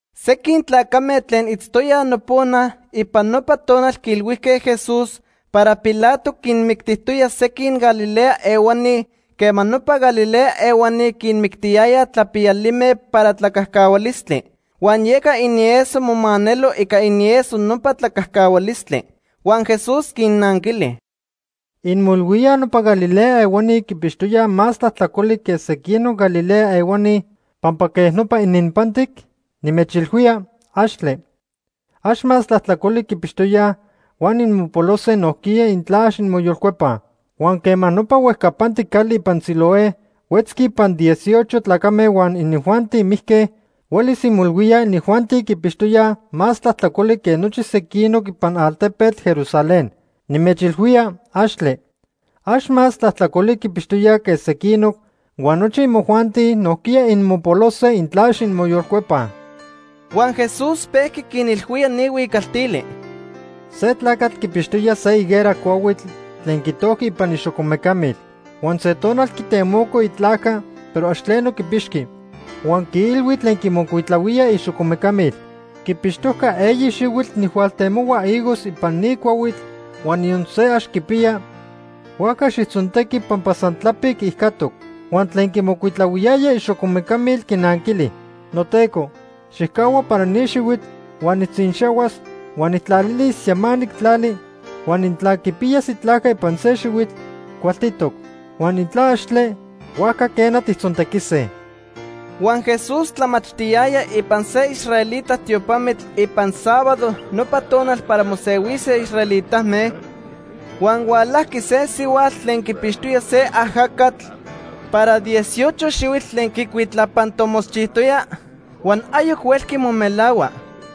Sequin tlacame tlen itztoyaj nopona ipan nopa tonal quiilhuijque Jesús para Pilato quinmictijtoya sequin Galilea ehuani quema nopa Galilea ehuani quinmictiyayaj tlapiyalime para tlacajcahualistli. Huan yeca inieso momanelo ica inieso nopa tlacajcahualistli. Huan Jesús quinnanquili: “¿Inmoilhuíaj nopa Galilea ehuani quipixtoyaj más tlajtlacoli que sequinoc Galilea ehuani pampa quej nopa ininpantic? Nimechilhuía, axtle. Ax más tlajtlacoli quipixtoyaj, huan inmopolose nojquiya intla ax inmoyolcuepaj. Huan quema nopa huejcapantic cali ipan Siloé huetzqui ipan dieciocho tlacame huan inijuanti mijque, huelis inmoilhuíaj inijuanti quipixtoyaj más tlajtlacoli que nochi sequinoc ipan altepetl Jerusalén. Nimechilhuía, axtle. Ax más tlajtlacoli quipixtoyaj que sequinoc, huan nochi imojuanti nojquiya inmopolose, intla ax inmoyolcuepaj.” Huan Jesús pejqui quinilhuía ni huicaltili: “Se tlacatl quipixtoya se higuera cuahuitl tlen quitojqui ipan ixocomeca mil. Huan se tonal quitemoco itlajca, pero ax tleno quipixqui. Huan quiilhui tlen quimocuitlahuía ixocomeca mil: ‘Quipixtojca eyi xihuitl nijhualtemohua higos ipan ni cuahuitl, huan niyon se ax quipiya, huajca xijtzontequi pampa san tlapic ijcatoc.’ Huan tlen quimocuitlahuiyaya ixocomeca mil quinanquili: ‘Noteco, xijcahua para ni xihuitl huan nijtzinxahuas huan nijtlalilis yamanic tlali, huan intla quipiyas itlajca ipan se xihuitl, cualtitoc, huan intla axtle, huajca quena, tijtzontequise.’” Huan Jesús tlamachtiyaya ipan se israelita tiopamitl ipan sábado nopa tonal para mosehuise israelitame, huan hualajqui se sihuatl tlen quipixtoya se ajacatl para dieciocho xihuitl tlen quicuitlapantomotzchijtoya huan ayoc huelqui momelahua.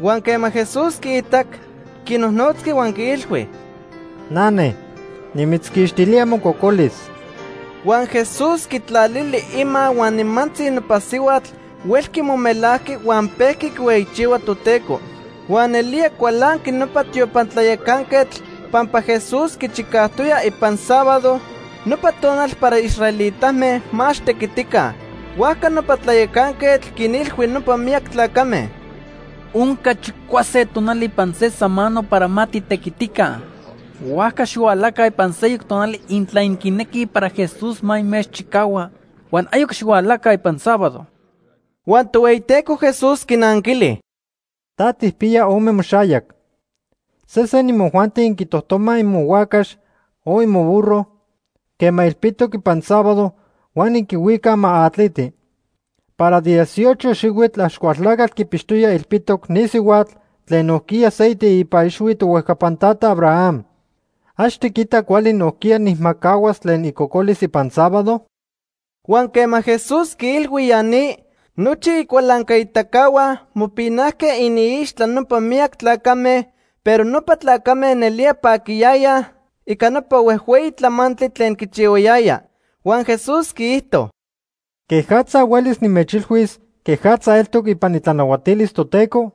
Huan quema Jesús quiitac, quinojnotzqui huan quiilhui: ―Nane, nimitzquixtilía mococolis. Huan Jesús quitlalili ima huan nimantzi nopa sihuatl huelqui momelajqui huan pejqui quihueyichihua Toteco. Huan nelía cualanqui nopa tiopan tlayacanquetl pampa Jesús quichicajtoya ipan sábado, nopa tonal para israelitame ma ax tequitica. Huajca nopa tlayacanquetl quinilhui nopa miyac tlacame: ―Onca chicuase tonali ipan se samano para ma titequitica, huajca xihualaca ipan seyoc tonal intla inquinequij para Jesús ma inmechchicahua, huan ayoc xihualaca ipan sábado. Huan Tohueyiteco Jesús quinanquili: ―Ta tijpiya ome moxayac. Se sen imojuanti inquitojtomaj imohuacax o imoburro quema ilpitoc ipan sábado, huan inquihuicaj ma atliti. Para dieciocho xihuitl Axcualtlacatl quipixtoya ilpitoc ni sihuatl tlen nojquiya se iteipa ixhui tohuejcapan tata Abraham. ¿Ax tiquita cuali nojquiya nijmacahuas tlen icocolis ipan sábado? Huan quema Jesús quiilhui ya ni, nochi icualancaitacahua mopinajque iniixtla nopa miyac tlacame, pero nopa tlacame nelía paquiyayaj ica nopa huejhueyi tlamantli tlen quichihuayaya. Huan Jesús quiijto: “¿Quejatza huelis nimechilhuis quejatza eltoc ipan itlanahuatilis Toteco?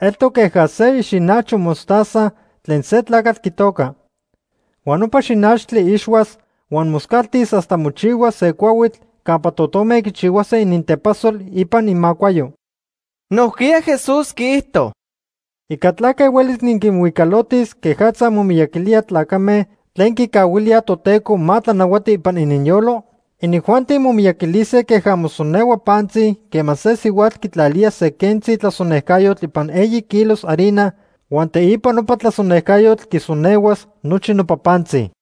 Eltoc queja se ixinajcho mostaza tlen se tlacatl quitoca. Huan nopa xinachtli ixhuas huan moscaltis hasta mochihuas se cuahuitl campa totome quichihuase inintepasol ipan imacuayo.” Nojquiya Jesús quiijto: “¿Ica tlaque huelis niquinhuicalotis quejatza momiyaquilía tlacame tlen quicahuilíaj Toteco ma tlanahuati ipan ininyolo? Inijuanti momiyaquilise queja mosonehua pantzi quema se sihuatl quitlalía se quentzi tlasonejcayotl ipan eyi kilos harina huan teipa nopa tlasonejcayotl quisonehuas nochi nopa pantzi.”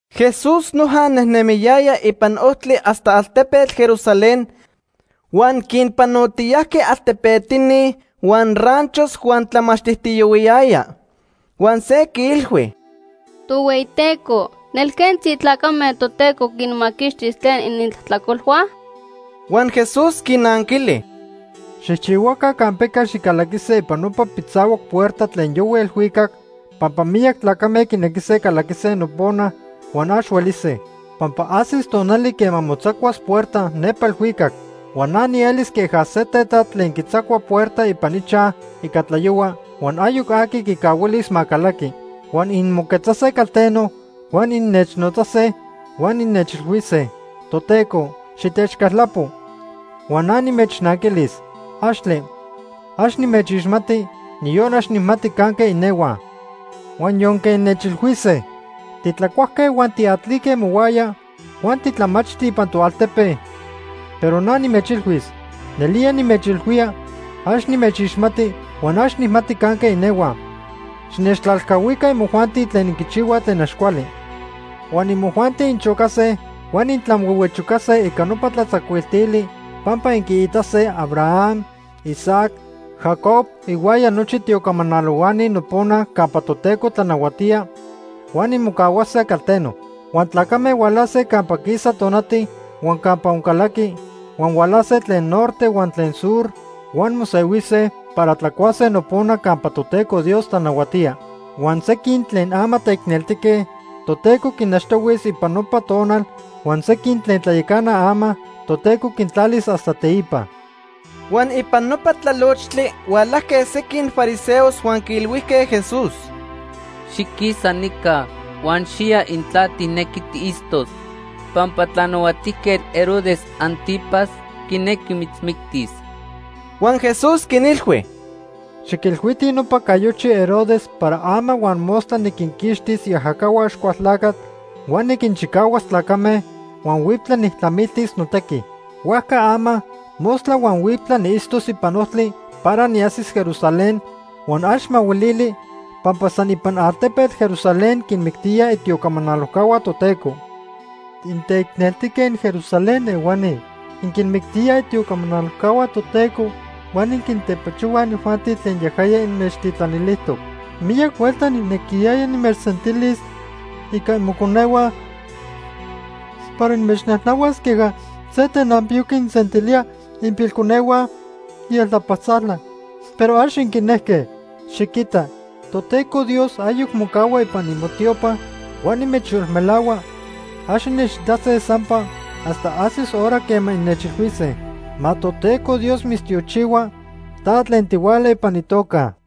Jesús noja nejnemiyaya ipan ojtli hasta altepetl Jerusalén huan quinpanotiyajqui altepetini huan ranchos huan tlamachtijtiyohuiyaya. Huan se quiilhui: ―Tohueyiteco, ¿nelquentzi tlacame Toteco quinmaquixtis tlen inintlajtlacolhua? Huan Jesús quinanquili: ―Xijchihuaca campeca xicalaquise ipan nopa pitzahuac puerta tlen yohui elhuicac, pampa miyac tlacame quinequise calaquise nopona huan ax huelise. Pampa ajsis tonali quema motzacuas puerta nepa elhuicac. Huan na nielis queja se tetat tlen quitzacua puerta ipan ichaj ica tlayohua huan ayoc aqui quicahuilis ma calaqui. Huan inmoquetzase calteno, huan innechnotzase huan innechilhuise: ‘Toteco, xitechcaltlapo’, huan na nimechnanquilis: ‘¡Axtle! Ax nimechixmati, niyon ax nijmati canque inehuaj.’ Huan yonque innechilhuise: ‘Titlacuajque huan tiatlique mohuaya, huan titlamachti ipan toaltepe’, pero na nimechilhuis: ‘Nelía nimechilhuía, ax nimechixmati huan ax nijmati canque inehuaj. Xinechtlalcahuica imojuanti tlen inquichihuaj tlen ax cuali.’ Huan imojuanti inchocase huan intlanhuehuechocase ica nopa tlatzacuiltili pampa inquiitase Abraham, Isaac, Jacob ihuaya nochi tiocamanalohuani nopona campa Toteco tlanahuatía, huan inmocahuase calteno. Huan tlacame hualase campa quisa tonati huan campa oncalaqui, huan hualase tlen norte huan tlen sur huan mosehuise para tlacuase nopona campa Toteco Dios tlanahuatía. Huan sequin tlen ama teicneltique, Toteco quinachtohuis ipan nopa tonal, huan sequin tlen tlayacanaj ama, Toteco quintlalis hasta teipa. Huan ipan nopa tlalochtli hualajque sequin fariseos huan quiilhuijque Jesús: ―Xiquisa nica huan xiya intla tijnequi tiitztos pampa Tlanahuatijquetl Herodes Ántipas quinequi mitzmictis. Huan Jesús quinilhui: ―Xiquilhuitij nopa cayochi Herodes para ama huan mostla niquinquixtis iajacahua Axcualtlacatl huan niquinchicahuas tlacame, huan huiptla nijtlamiltis notequi. Huajca ama, mostla huan huiptla niitztos ipan ojtli para niajsis Jerusalén huan ax mahuilili, pampa san ipan altepetl Jerusalén quinmictíaj itiocamanalojcahua Toteco. “¡Inteicneltijque inJerusalén ehuani! Inquinmictíaj itiocamanalojcahua Toteco huan inquintepachohuaj inijuanti tlen yajaya inmechtitlanilijtoc. Miyac huelta nijnequiyaya nimechsentilis ica imoconehua para nimechnajnahuas queja se tenanpiyo quinsentilía ipilconehua ieltlapaltzala, pero ax inquinejque. Xiquita, Toteco Dios ayoc mocahua ipan imotiopa, huan nimechyolmelahua ax innechitase sampa hasta ajsis hora quema innechilhuise: ‘Ma Toteco Dios mitztiochihua Ta tlen tihuala ipan itoca.’”